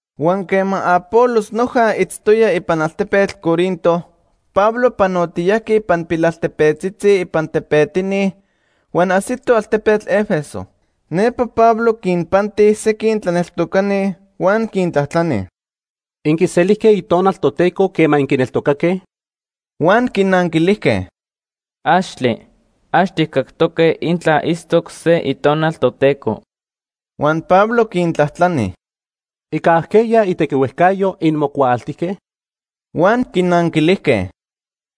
Huan quema Apolos noja itztoya ipan altepetl Corinto, Pablo panotiyajqui ipan pilaltepetzitzi ipan tepetini huan ajsito altepetl Éfeso. Nepa Pablo quinpanti sequin tlaneltocani, huan quintlajtlani: ―¿Inquiselijque Itonal Toteco quema inquineltocaque? Huan quinanquilijque: ―¡Axtle! Ax tijcactoque intla itztoc se Itonal Toteco. Huan Pablo quintlajtlani: ―¿Ica ajqueya itequihuejcayo inmocuaaltijque? Huan quinanquilijque: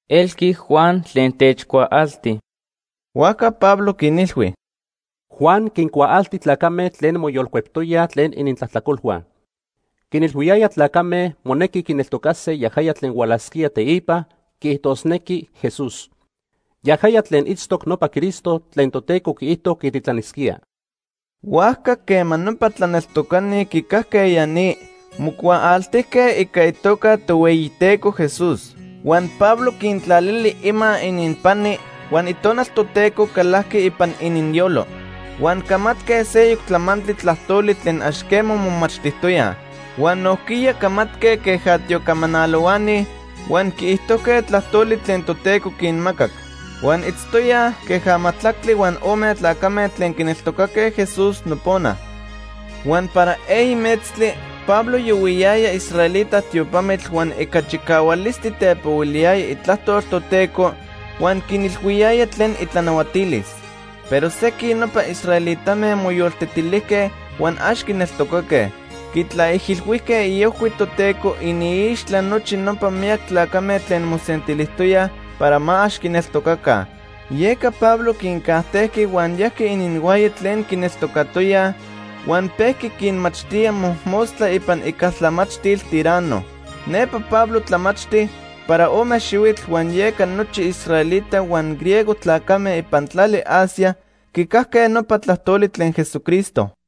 ―Elqui Juan tlen techcuaalti. Huajca Pablo quinilhui: ―Juan quincuaalti tlacame tlen moyolcueptoyaj tlen inintlajtlacolhua. Quinilhuiyaya tlacame monequi quineltocase yaja tlen hualasquía teipa, quiijtosnequi Jesús. Yajaya tlen itztoc nopa Cristo tlen Toteco quiijto quititlanisquía. Huajca quema nopa tlaneltocani quicajque ya ni, mocuaaltijque ica itoca Tohueyiteco Jesús. Huan Pablo quintlalili ima ininpani huan Itonal Toteco calajqui ipan ininyolo. Huan camatque seyoc tlamantli tlajtoli tlen ax quema momachtijtoyaj. Huan nojquiya camatque queja tiocamanalohuani huan quiijtojque tlajtoli tlen Toteco quinmacac. Huan itztoyaj queja majtlactli huan ome tlacame tlen quineltocaque Jesús nopona. Huan para eyi metztli Pablo yohuiyaya israelita tiopamitl huan ica chicahualistli tepohuiliyaya itlajtol Toteco huan quinilhuiyaya tlen itlanahuatilis. Pero sequin nopa israelitame moyoltetilijque huan ax quineltocaque. Quitlaijilhuijque iojhui Toteco iniixtla nochi nopa miyac tlacame tlen mosentilijtoyaj para ma ax quineltocaca. Yeca Pablo quincajtejqui huan yajqui ininhuaya tlen quineltocatoyaj huan pejqui quinmachtía mojmostla ipan icaltlamachtil Tiranno. Nepa Pablo tlamachti para ome xihuitl huan yeca nochi israelita huan griego tlacame ipan tlali Asia quicajque nopa tlajtoli tlen Jesucristo.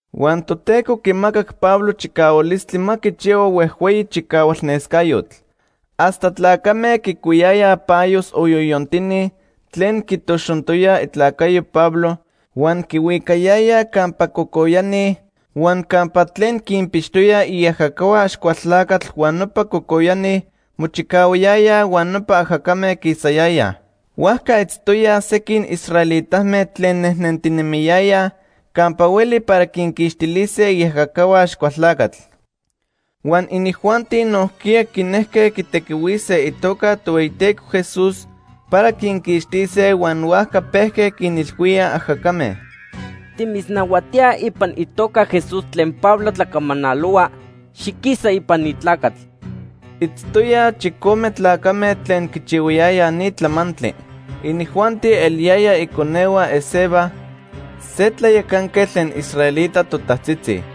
Huan Toteco quimacac Pablo chicahualistli ma quichihua huejhueyi chicahualnescayotl. Hasta tlacame quicuiyayaj payos o yoyontini tlen quitoxontoya itlacayo Pablo huan quihuicayayaj campa cocoyani huan campa tlen quinpixtoyaj iajacahua Axcualtlacatl huan nopa cocoyani mochicahuayayaj huan nopa ajacame quisayayaj. Huajca itztoyaj sequin israelitame tlen nejnentinemiyayaj campa hueli para quinquixtilise iajacahua Axcualtlacatl. Huan inijuanti nojquiya quinejque quitequihuise itoca Tohueyiteco Jesús para quinquixtise huan huajca pejque quinilhuíaj ajacame: “Timitznahuatíaj ipan itoca Jesús tlen Pablo tlacamanalohua, xiquisa ipan ni tlacatl.” Itztoyaj chicome tlacame tlen quichihuayayaj ni tlamantli. Inijuanti eliyayaj iconehua Esceva, se tlayacanquetl tlen israelita totajtzitzi.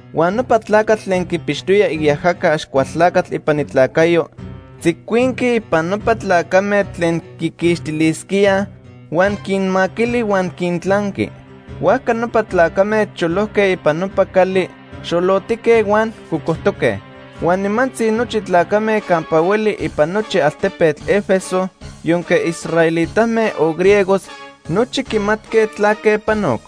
Huan nopa tlacatl tlen quipixtoya iajaca Axcualtlacatl ipan itlacayo, tzicuinqui ipan nopa tlacame tlen quiquixtilisquíaj huan quinmaquili huan quintlanqui. Huajca nopa tlacame cholojque ipan nopa cali, xolotique huan cocojtoque. Huan nimantzi nochi tlacame campa hueli ipan nochi altepetl Éfeso, yonque israelitame o griegos, nochi quimatque tlaque panoc.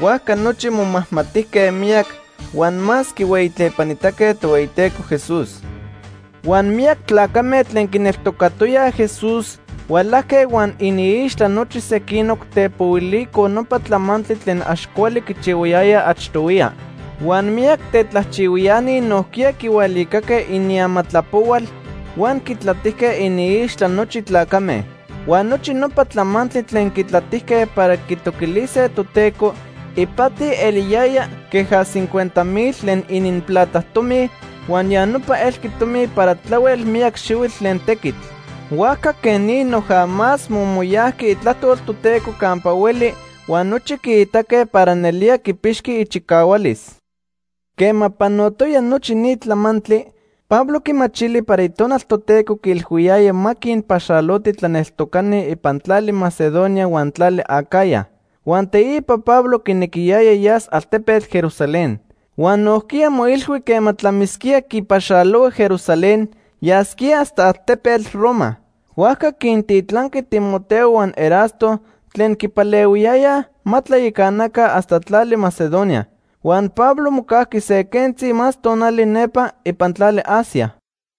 Huajca nochi momajmatijque miyac huan más quihueyitlepanitaque Tohueyiteco Jesús. Huan miyac tlacame tlen quineltocatoyaj Jesús hualajque huan iniixtla nochi sequinoc, tepohuilicoj nopa tlamantli tlen ax cuali quichihuayayaj achtohuiya. Huan miyac tetlajchihuiani nojquiya quihualicaque iniamatlapohual huan quitlatijque iniixtla nochi tlacame. Huan nochi nopa tlamantli tlen quitlatijque para quitoquilise Toteco ipati eliyaya queja cincuenta mil tlen ininplata tomi huan ya nopa elqui tomi para tlahuel miyac xihuitl tlen tequitl. Huajca quej ni noja más momoyajqui itlajtol Toteco campa hueli huan nochi quiitaque para nelía quipixqui ichicahualis. Quema panotoya nochi ni tlamantli, Pablo quimachili para Itonal Toteco quiilhuiyaya ma quinpaxaloti tlaneltocani ipan tlali Macedonia huan tlali Acaya. Huan teipa Pablo quinequiyaya yas altepetl Jerusalén. Huan nojquiya moilhui quema tlamisquía quipaxalohua Jerusalén, yasquía hasta altepetl Roma. Huajca quintitlanqui Timoteo huan Erasto tlen quipalehuiyayaj ma tlayacanaca hasta tlali Macedonia. Huan Pablo mocajqui se quentzi más tonali nepa ipan tlali Asia.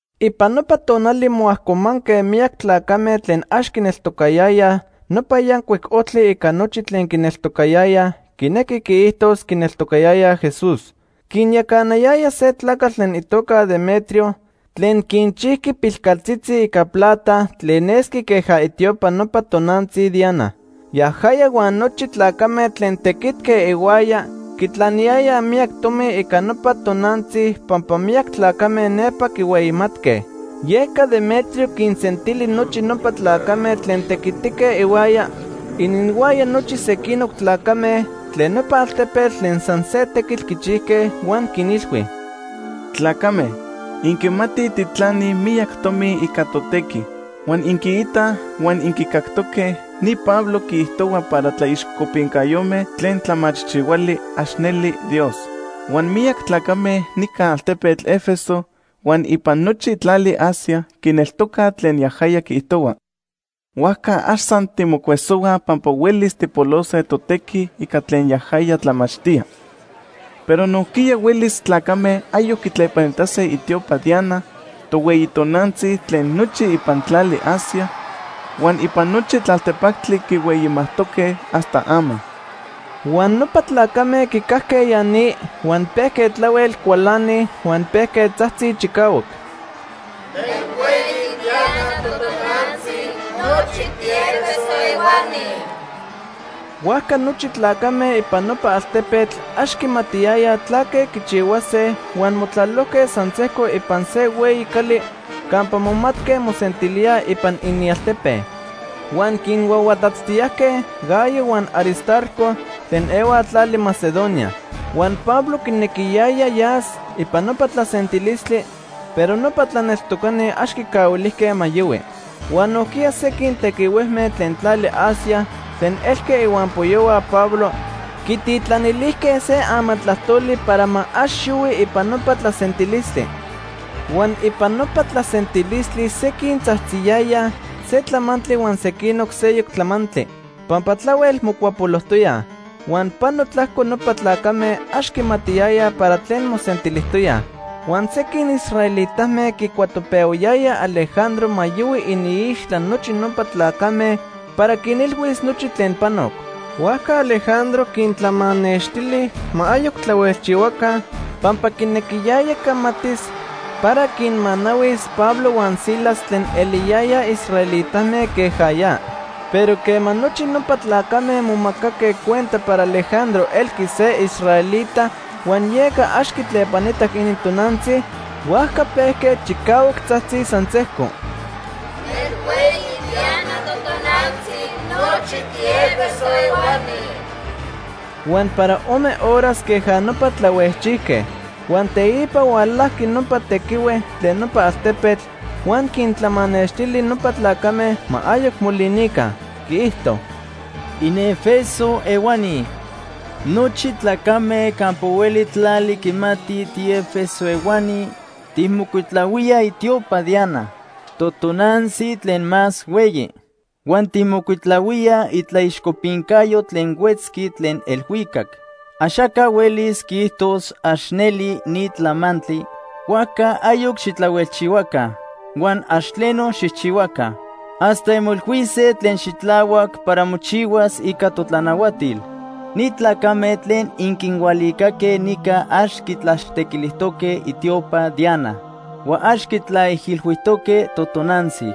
Ipan nopa tonali moajcomanque miyac tlacame tlen ax quineltocayayaj Nopa Yancuic Ojtli ica nochi tlen quineltocayayaj, quinequi quiijtos, quineltocayayaj Jesús. Quinyacanayaya se tlacatl tlen itoca Demetrio tlen quinchijqui pilcaltzitzi ica plata tlen nesqui queja itiopa nopa tonantzi Diana. Yajaya huan nochi tlacame tlen tequitque ihuaya quitlaniyayaj miyac tomi ica nopa tonantzi pampa miyac tlacame nepa quihueyimatque. Yeca Demetrio quinsentili nochi nopa tlacame tlen tequitique ihuaya, ininhuaya nochi sequinoc tlacame tlen nopa altepetl tlen san se tequitl quichijque huan quinilhui: “Tlacame, inquimatij tijtlanij miyac tomi ica totequi. Huan inquiitaj huan inquicactoque ni Pablo quiijtohua para tlaixcopincayome tlen tlamachijchijhuali ax neli dios. Huan miyac tlacame nica altepetl Éfeso huan ipan nochi tlali Asia quineltocaj tlen yajaya quiijtohua. Huajca ax san timocuesohuaj pampa huelis tijpolose totequi ica tlen yajaya tlamachtía, pero nojquiya huelis tlacame ayoc quitlepanitase itiopa Diana, tohueyi tonantzi tlen nochi ipan tlali Asia huan ipan nochi tlaltepactli quihueyimajtoque hasta ama.” Huan nopa tlacame quicajque ya ni, huan pejque tlahuel cualanij huan pejque tzajtzij chicahuac: “¡Nelhueyi Diana totonantzi nochi tiÉfeso ehuani!” Huajca nochi tlacame ipan nopa altepetl ax quimatiyayaj tlaque quichihuase huan motlalojque san sejco ipan se hueyi cali campa momatque mosentilíaj ipan inialtepe. Huan quinhuahuatatztiyajque Gayo huan Aristarco tlen ehuaj tlali Macedonia. Huan Pablo quinequiyaya yas ipan nopa tlasentilistli, pero nopa tlaneltocani ax quicahuilijque ma yohui. Huan nojquiya sequin tequihuejme tlen tlali Asia tlen elque ihuampoyohua Pablo quititlanilijque se amatlajtoli para ma ax yohui ipan nopa tlasentilistli. Huan ipan nopa tlasentilistli sequin tzajtziyayaj se tlamantli huan sequinoc seyoc tlamantli, pampa tlahuel mocuapolojtoyaj. Huan pano tlajco nopa tlacame ax quimatiyayaj para tlen mosentilijtoyaj. Huan sequin israelitame quicuatopehuayayaj Alejandro ma yohui iniixtla nochi nopa tlacame para quinilhuis nochi tlen panoc. Huajca Alejandro quintlamanextili ma ayoc tlahuelchihuaca pampa quinequiyaya camatis para quinmanahuis Pablo huan Silas tlen eliyayaj israelitame queja ya. Pero quema nochi nopa tlacame momacaque cuenta para Alejandro elqui se israelita huan yeca ax quitlepanitac inintonantzi, huajca pejque chicahuac tzajtzij san sejco: “¡Nelhueyi Diana totonantzi nochi tiÉfeso ehuani!” Huan para ome horas queja nopa tlahuejchijque. Huan teipa hualajqui nopa tequihue tlen nopa altepetl huan quintlamanextili nopa tlacame ma ayoc molinica. Quiijto: “¡InÉfeso ehuani! Nochi tlacame campa hueli tlali quimatij tiÉfeso ehuani tijmocuitlahuíaj itiopa Diana, totonantzi tlen más hueyi, huan tijmocuitlahuíaj itlaixcopincayo tlen huetzqui tlen elhuicac. Axaca huelis quiijtos ax neli ni tlamantli; huajca ayoc xitlahuelchihuaca huan ax tleno xijchihuaca hasta inmoilhuise tlen xitlahuac para mochihuas ica totlanahuatil. Ni tlacame tlen inquinhualicaque nica ax quitlaxtequilijtoque itiopa Diana huan ax quitlaijilhuijtoque totonantzi.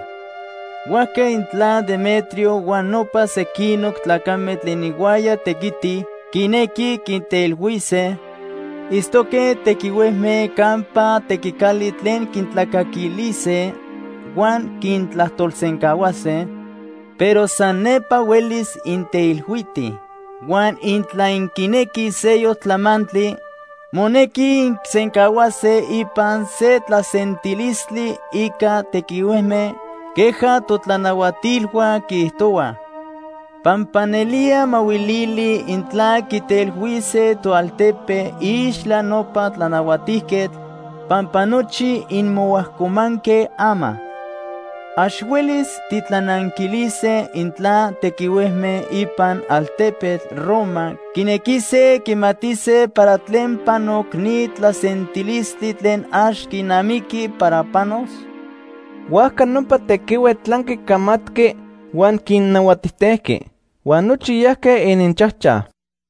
Huajca intla Demetrio huan nopa sequinoc tlacame tlen ihuaya tequitij quinequij quinteilhuise, itztoque tequihuejme campa tequicali tlen quintlacaquilise huan quintlajtolsencahuase, pero san nepa huelis inteilhuitij. Huan intla inquinequij seyoc tlamantli, monequi inquisencahuase ipan se tlasentilistli ica tequihuejme queja totlanahuatilhua quiijtohuaj. Pampa nelía mahuilili intla quiteilhuise toaltepe iixtla nopa tlanahuatijquetl pampa nochi inmoajcomanque ama. ¿Ax huelis titlananquilise intla tequihuejme ipan altepetl Roma quinequise quimatise para tlen panoc ni tlasentilistli tlen ax quinamiqui para panos?” Huajca nopa tequihue tlanqui camatqui huan quinnahuatijtejqui. Huan nochi yajque ininchajchaj.